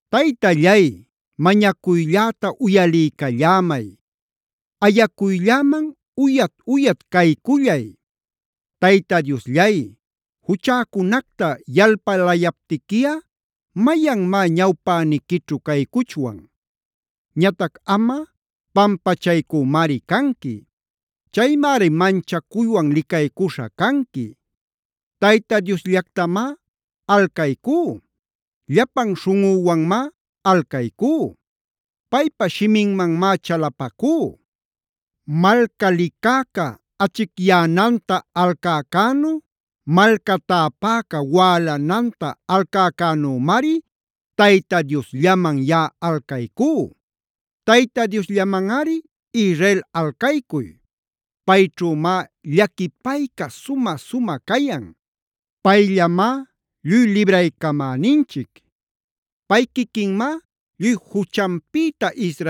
Taytallay, mañacuylläta uyaliycallämay. Ayacuylläman uyat-uyat caycullay. Tayta Diosllay, juchäcunacta yalpalayaptiquiꞌa ¿mayanmá ñawpäniquićhu caycuchwan? Ñatac amꞌa pampachaycümari canqui. Chaymari manchacuywan licaycuśha canqui. Tayta Diosllactamá alcaycú. Llapan śhunꞌüwanmá alcaycú. Paypa shiminmanmá chalapacú. Malca licäca achicyänanta alcäcänu, malca täpäca wälananta alcäcänümari Tayta Diosllaman yaꞌa alcaycú. Tayta Diosllamanꞌari, Israel alcaycuy. Payćhümá llaquipayca sumä-sumä cayan. Payllamá lluy libraycamäninchic. Pay quiquinmá lluy juchanpïta